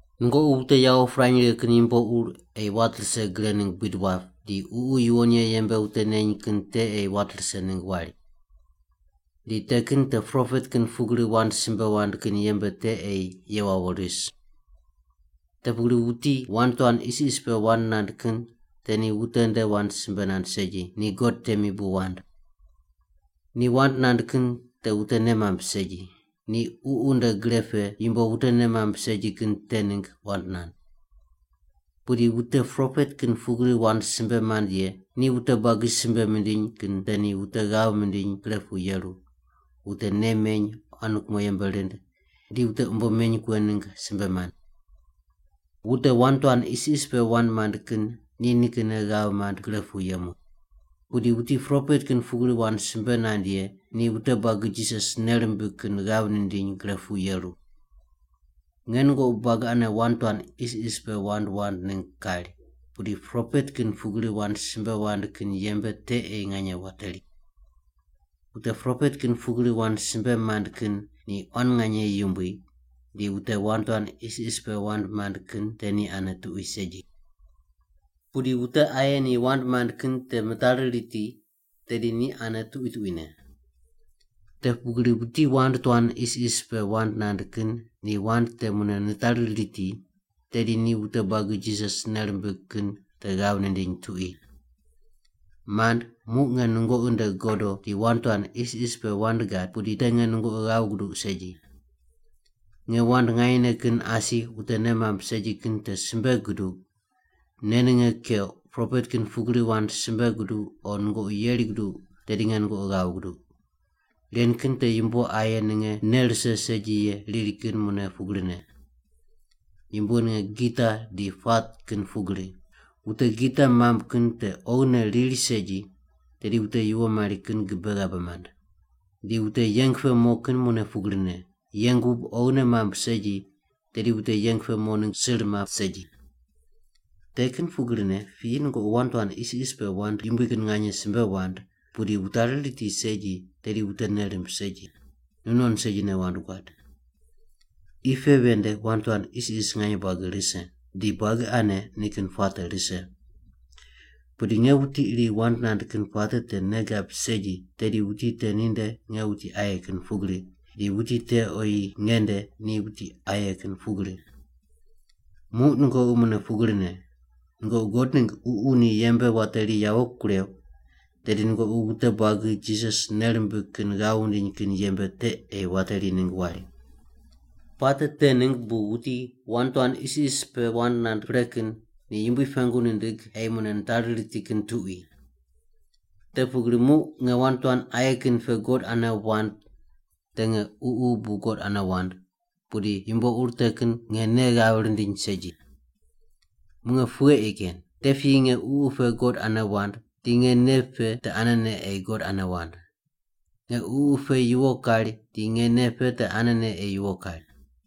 Nungoqi wute yawo pirany righe kin yumbo ur ei wat rise gre ningg buid wap, di Ququ Yuwon Ye yembe wute neny kin te ei wat rise ningg wari. Di te kin te propet kin pugri wand simbe wand kin yembe te ei ye wawo ris. Te pugri wuti wand tuan isis pe wand nand kin te ni wute nde wand simbe nand segi, ni God temi bu wand. Ni wand nand kin te wute nei mamb segi. Ni Ququ nde gre pe yumbo wute nei mamb segi kin te ningg wand nand. Pudi wute propet kin pugri wand simbe mand ye ni wute buagi simbe mindiny kin te ni wute ghav mindiny gre pu yeru, wute nei meny quan kumo yembe rind, di wute umbo meny kughe ningg simbe mand. Wute wand tuan isis pe wand mand kin ni nikinne ghav mand gre pu yemu. Pudi wuti propet kin pugri wand simbe nand ye ni wute buagi Jisas nei rimbig kin ghav nindiny gre pu yeru. Nge nungoqi buagi ane wand tuan isis pe wand wand ningg kari, pudi propet kin pugri wand simbe wand kin yembe te ei nganye wateri. Wute propet kin pugri wand simbe mand kin ni quan nganye yumbui di wute wand tuan isis pe wand mand kin te ni ane tuqui segi. Pudi wute aye ni wand mand kin te mitari riti, tedi ni ane tuqui tuquine. Te pugri wuti wand tuan isis pe wand nand kin ni wand te mune nitari riti, tedi ni wute buagi Jisas nei rimbig kin te ghav nindiny tuqui. Mand, muq nge nungoqi nde godo di wand tuan isis pe wand gad pudi te nge nungoqi ghav guduq segi. Nge wand nganyene kin asi wute nei mamb segi kin te simbe guduq, nei ninge keuq, propet kin pugri wand simbe guduq, o nungoqi yeri guduq tedi nge nungoqi ghav guduq. Ren kin te yumbo aye ninge nei rise segi ye riri kin mune pugrine. Yumbo ninge gita di puat kin pugri. Wute gita mamb kin te oghine riri segi tedi wute yuwo mari kin gibe ghabe mand. Di wute yeng pe mo kin mune pugrine, yeng wub oghine mamb segi tedi wute yeng pe mo ningg sir map segi. Te kin pugrine piyi nungoqi wand tuan isis pe wand yumbui kin nganye simbe wand pudi wutari riti segi, tedi wute nei rimb segi. Nu non segine wand guad. Qi pe ven nde wand tuan isis nganye buagi rise, di buagi ane ni kin wand puate rise. Pudi nge wuti iri wand nand kin puate te nei gab segi tedi wuti te ninde nge wuti aye kin pugri, di wuti te oyi nge nde ni wuti aye kin pugri. Muq nungoqi mune pugrine. Nungoqi God ningg Ququ ni yembe wateri yawo kureuq, tedi nungoqi wute buagi Jisas nei rimbig kin ghav wundiny kin yembe te ei wateri ningg wari. Puate te ningg bu wuti wand tuan isis pe wand nand pre kin ni Yumbui pengu nindig ei mune nitari riti kin tuqui. Te pugri muq nge wand tuan aye kin pe God ane wand te nge ququ bu God ane wand, pudi yumbo ur te kin nge nei ghav rindiny segi. Muq nge pughe ei ken? Te piyi nge ququ pe God ane wand di nge nei pe te anene ei God ane wand. Nge ququ pe yuwo kari di nge nei pe te anene ei yuwo kari.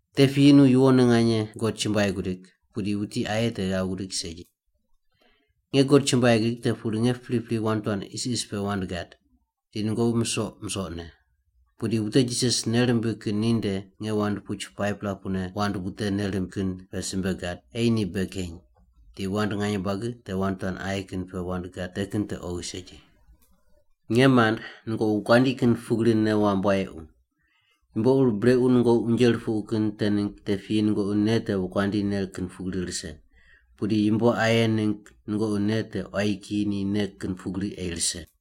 Te piyi nu yuwonne nganye God chumbuai gudig, pudi wuti aye te ghav gudig segi. Nge God chumbuai gidig te pugri nge pripri wand tuan isis pe wand gad, di nungoqi musoq musoqne. Pudi wute Jisas nei rimbig kin ninde nge wand puch 5-pela pune wand wute nei rimb kin pe simbe gad ei ni bei keny, di wand nganye buagi te wand tuan aye kin pe wand gad te kin te oghi segi. Nge mand, nungoqi wokuandi kin pugri nei wamb wayequ. Yumbo ur brequ nungoqi unje rupuqu kin te ningg te piyi nungoqi nei te wokuandi nei kin pugri rise, pudi yumbo aye ningg nungoqi nei te quayi kiyi ni nei kin pugri ei rise.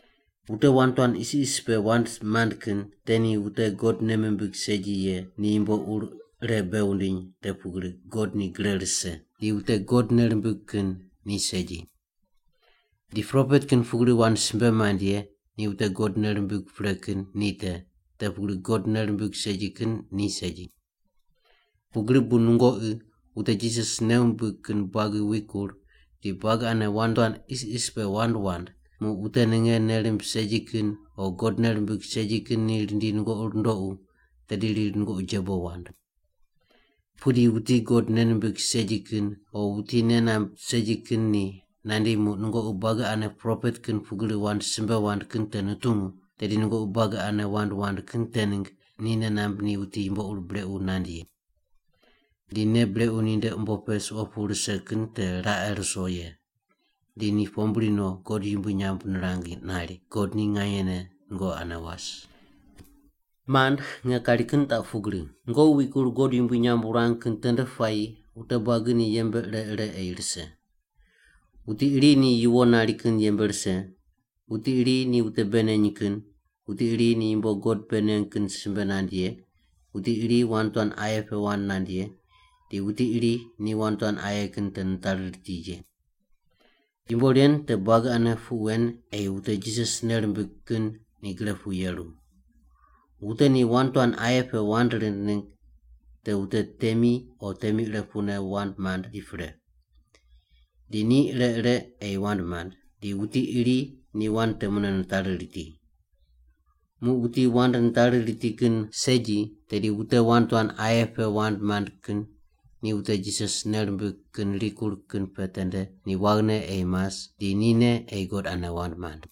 Wute wand tuan isis pe wand mand kin te ni wute God nei mimbig segi ye ni yumbo ur ire bei wundiny te pugri God ni gre rise, di wute God nei rimbig kin ni segi. Di propet kin pugri wand simbe mand ye ni wute God nei rimbig pre kin ni te, te wute God nei rimbig segi kin ni segi. Pugri bu nungoqi wute Jisas nei wumbig kin buagi wikur di buagi ane wand tuan isis pe wand wand, muq wute ninge nei rimb segi kin o God nei rimbig segi kin ni rindi nungoqi rundoqu tedi riri nungoqi jebo wand. Pudi wuti God nei nimbig segi kin o wuti nei namb segi kin ni nandi muq nungoqi buagi ane propet kin pugri wand simbe wand kin te nutungu, tedi nungoqi buagi ane wand wand kin te ningg ni nei namb ni wuti yumbo ur brequ nand ye. Di nei brequ ninde umbo pe suqo pu rise kin te raqe ruso ye. Di ni pombri no God yumbui nyamb nirang nari, “God ni nganyene nungoqi ane was!” Mand, nge kari kin taq pugri. Nungoqi wikur God yumbui nyamb wurang kin tende puayi wute buagi ni yembe ire ire ei rise. Wuti iri ni yuwo nari kin yembe rise, wuti iri ni wute bei neny kin, wuti iri ni yumbo God bei neng kin simbe nand ye, wuti iri wand tuan aye pe wand nand ye, di wuti iri ni wand tuan aye kin te nitari riti ye. Yumbo ren te buagi ane puq wen ei wute Jisas nei rimbig kin ni gre pu yeru. Wute ni wand tuan aye pe wand rind ningg te wute temi o temi ire pune wand mand di pre. Di ni ire ire ei wand mand, di wuti iri ni wand te mune nitari riti. Muq wuti wand nitari riti kin segi, tedi wute wand tuan aye pe wand mand kin ni wute Jisas nei rimbig kin rikur kin pe tende ni waghine ei mas di nine ei God ane wand mand.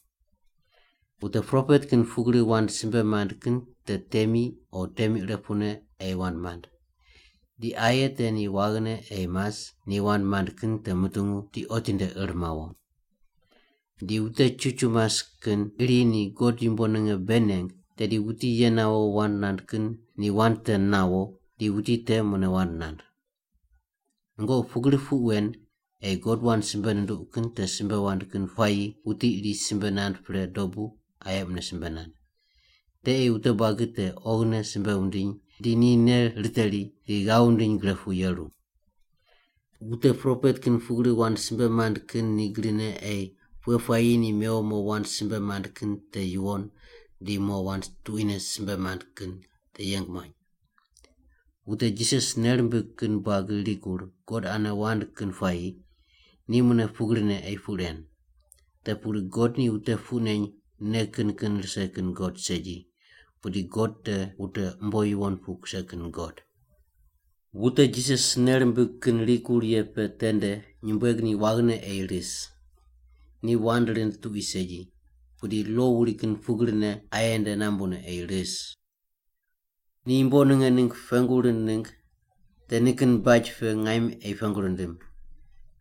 Wute propet kin pugri wand simbe mand kin te temi o temi ire pune ei wand mand. Di aye te ni waghine ei mas ni wand mand kin te mutungu di otinde ir mawo. Di wute chuchu mas kin iri ni God yumbo ninge bei neng, tedi wuti ye nawo wand nand kin ni wand te nawo, di wuti te mune wand nand. Nungoqi pugri puq wen ei God wand simbe nunduq kin te simbe wand kin puayi wuti iri simbe nand pre dobu aye mune simbe nand. Te ei wute buagi te oghine simbe wundiny di ni nei riteri di ghav wundiny gre pu yeru. Wute propet kin pugri wand simbe mand kin ni grine ei pughe puayi ni mewo mo wand simbe mand kin te yuwon di mo wand tuquine simbe mand kin te yeng muany. Wute Jisas nei rimbig kin buagi rikur God ane wand kin puayi ni mune pugrine ei puq ren. Te pugri God ni wute puq neny nei kin kin rise kin God segi, pudi God te wute umbo yuwon pu kuse kin God. Wute Jisas nei rimbig kin rikur ye pe tende nyumbueg ni waghine ei ris. Ni wand rind tuqui segi, pudi lo wuri kin pugrine aye nde nambune ei ris. Ni yumbo ninge ningg pengu rind ningg te nikin baj pe ngaim ei pengu rindim.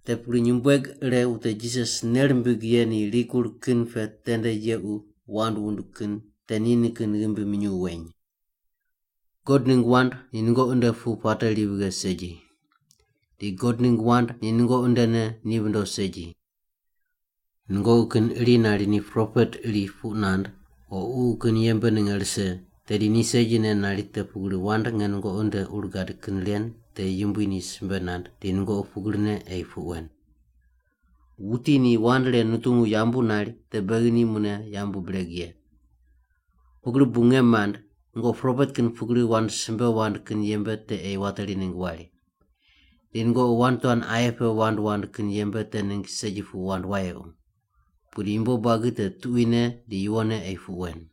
Te pugri nyumbueg ire wute Jisas nei rimbig ye ni rikur kin pe tende yequ wand wund kin te ni nikin ghimbi minyuw weny. God ningg wand ni nungoqi nde pu puate ri vighe segi. Di God ningg wand ni nungoqi ndene ni vindo segi. Nungoqi kin iri nari ni propet iri puq nand o Ququ kin yembe ninge rise, tedi ni segine nari te pugri wand nge nungoqi nde ur gad kin ren te Yumbui ni simbe nand di nungoqi pugrine ei puq wen. Wuti ni wand ren nutungu yambu nari te beghi ni mune yambu bireg ye. Pugri bu, nge mand, nungoqi propet kin pugri wand simbe wand kin yembe te ei wateri ningg wari. Di nungoqi wand tuan aye pe wand wand kin yembe te ningg segi puq wand wayequ. Pudi yumbo buagi te tuquine di yuwonne ei puq wen.